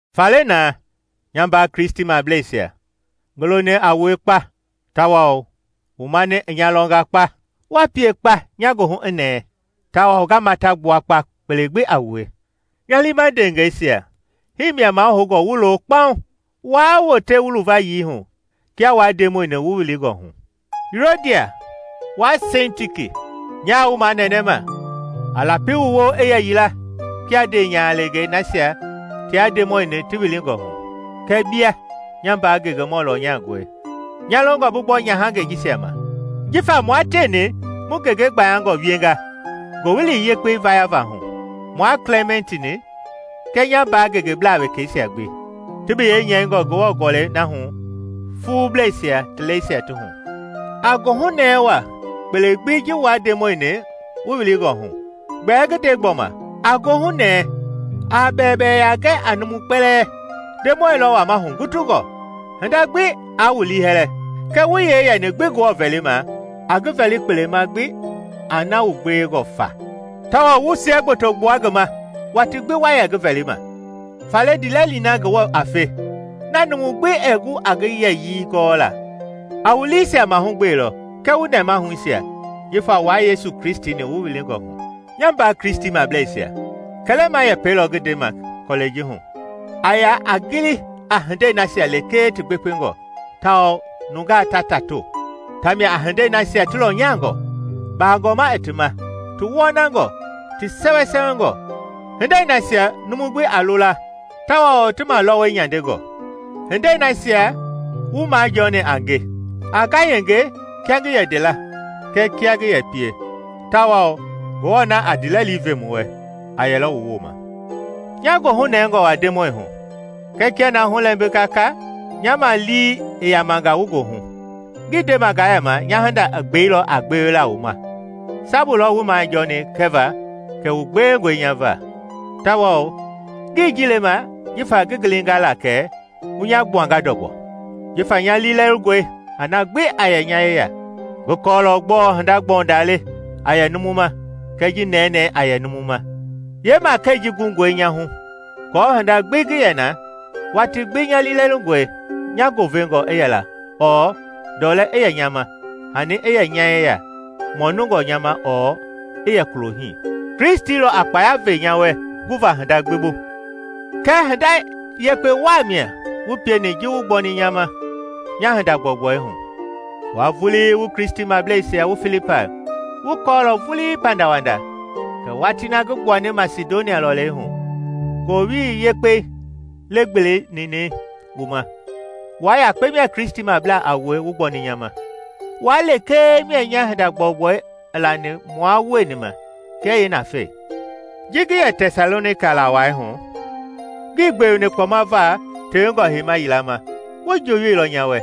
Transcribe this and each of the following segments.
Faale na, nya mbaa Kristimableisia, ngi loni a wue kpa tawao wu mani i nya lɔnga kpa! Wa pie kpa nya goohu i nɛɛ tawao nga mata gbua kpa kpele gbi a wue! Nya liima ndeengɛisia, hii mia mahoungɔ wu loo kpaŋ, waa wote wu luvayii hu kia wua Ndemɔi-ni wu wilingɔ hu. Yuodia wua Sintiki, nyaa wu manɛnɛma, a lapi wu woo i yɛ yila kia ndeenyahalengei nasia tia Ndemɔi-ni ti wilingɔ hu. Kɛɛ bia, nya mbaa ngengemɔ lɔnyangɔi, nya longɔ bi gbɔ nyahangɛi jisia ma; jifa mua tieni mu ngenge gbayangɔ wienga Ngowili Yekpei vayava hu, mua Klɛmɛnt-ni kɛɛ nya mbaa ngengeblaa wekɛisia gbi, ti biyɛi nyɛingɔ Ngewɔ Gɔlɛi na hu fuublɛisia ti lɛisia ti hu. A goohu nɛɛ waa kpele gbi ji wua Ndemɔi-ni wu wilingɔ hu. Gbɛɛ ngi nde gbɔma: a goohunɛɛ. A bɛwɛbɛwɛya gɛ a numu kpɛlɛɛ. Ndemɔi lɔ wama hugutungɔ. Hinda gbi aa wu liihɛlɛ, kɛɛ wu yee yɛni gbi Ngewɔ vɛlima, a ngi vɛli kpele gbi a na wu gbewengɔ fa tawao wu siɛgboto gbua ngi ma watii gbi wa yɛ ngi vɛlima. Faale ndiilɛli na Ngewɔ a fe, na numu gbi ɛɛ gu a ngi yɛyii gɔla a wu liisia mahugbelɔ kɛɛ wu nɛmahuisia jifa wua Yesu Kristi-ni wu wilingɔ hu. Nya mbaa Kristimableisia, kɛlɛma yɛpɛi lɔ ngi ndema kɔlɛi ji hu a ya a gili a hindei nasia lekee ti gbekpengɔ tawao nungaa ta tato: tia mia a hindei nasia ti lɔnyangɔ, baagɔma i ti ma, ti wɔnangɔ, ti sɛwɛsɛwɛngɔ, hindei nasia numu gbi a lo la tawao ti malɔwɔi nyandengɔ. Hindei nasia wu majɔɔni a nge, a ngayenge kia ngi yɛ nde la kɛɛ kia ngi yɛ pie; tawao Ngewɔ na a ndiilɛli ve mu wɛ a yɛlɔ wu wooma. Nya goohu nɛngɔ wa Ndemɔi hu, kɛ kia na hu i lɛmbinga ka, nya ma lii i yamanga wu goohu. Ngii ndema ngaa yɛma nya hinda i gbeilɔ a gbewela wu ma sabu lɔ wuii majɔɔni kɛva kɛ wu gbewengɔe nya va. Tawao ngii ji lema jifa ngi gilinga la kɛ wu nya gbuanga ndɔgbɔ, jifa nya liilɛlingɔe a na gbi a yɛ nya yeya. Ngi kɔɔlɔ gbɔɔ hinda-gbɔundaa le a yɛ numu ma kɛɛ ji nɛnɛɛ a yɛ numu ma. Yeemakɛi ji gungɔe nya hu aako hinda gbi ngi yɛ na, watii gbi nya liilɛlingɔe, nya goovengɔ i yɛla ɔɔ ndɔlɛ i yɛ nya ma, hani i yɛ nya yeya mɔnungɔ nya ma ɔɔ i yɛ kulo hii. Kristi lɔ a kpaya ve nya wɛ guva hinda gbi bu. Kɛɛ hinda yekpe waa mia wu pieni ji wu gbɔni nya ma nya hinda-gbɔugbɔi hu. Wua vulii wu Kristimableisia wu Filipai wu kɔɔlɔ vulii pandawanda kɛ watii na ngi gbuani Masidonia lɔlei hu, Ngowili Yekpei legbele ninɛi wu ma, wua yakpe mia Kristimablaa a wue wu gbɔni nya ma; wua lekee mia nya hinda-gbɔugbɔi i lani mua wueni ma kɛɛ yeenafei. Ji ngi yɛ Tɛsalonika la wai hu, ngi gbeweni kpɔma va tewengɔ heima yila ma, wu njooyoilɔ nya wɛ.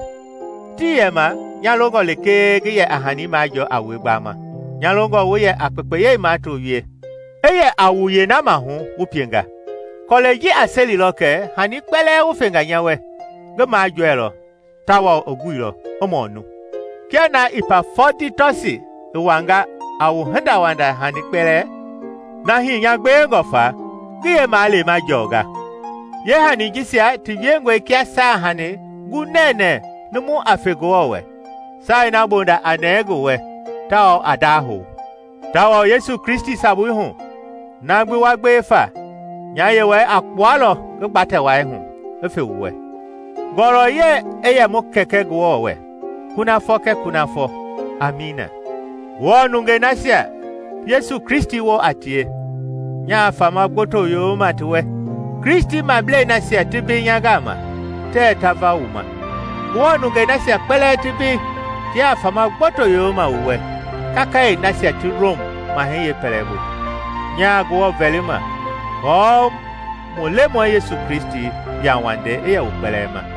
Tii yɛma nya longɔ lekee ngi yɛ a hani majɔɔ a wue gbama; nya longɔ wu yɛ a kpekpeyei mato wie, i yɛ a wu yeena mahu wu pienga. Kɔlɛi ji a selilɔ kɛ hani kpɛlɛɛ wu fenga nya wɛ, ngi majɔɛilɔ tawao i guilɔ, i mɔnu! Kia na Ipafɔditɔsi i wanga a wu hindawanda hani kpɛlɛɛ, na hii nya gbewengɔ fa ngi yeemaleema jɔnga. Yeehani jisia ti wiengɔe kia saahanii gunɛnɛ numu a fe Ngewɔ wɛ, saai na bonda a nɛɛ ngi wɛ tawao a ndahou. Tawao Yesu Kristi sabui hu, na gbi wa gbewe fa, nya Yewɔɛi a kpualɔ ngi gbatɛ wai hu i fe wu wɛ. Ngɔlɔyɛi i yɛ mu Kɛkɛ Ngewɔ wɛ kunafɔ kɛɛ kunafɔ! Amiina. Ngewɔ nungei nasia Yesu Kristi woo a tie, nya fama gboto yoyoma ti wɛ. Kristimablei nasia ti mbei nya gama, tɛ ta va wu ma. Ngewɔ nungei nasia kpɛlɛɛ ti mbei tiaa fama gboto yooyoma wu wɛ, kakayee nasia ti Rom Mahɛi yeepɛlɛbu. Nyaa Ngewɔ vɛlima kɔɔ mu Lemɔi Yesu Kristi yauwandei i yɛ wu kpɛlɛɛ ma.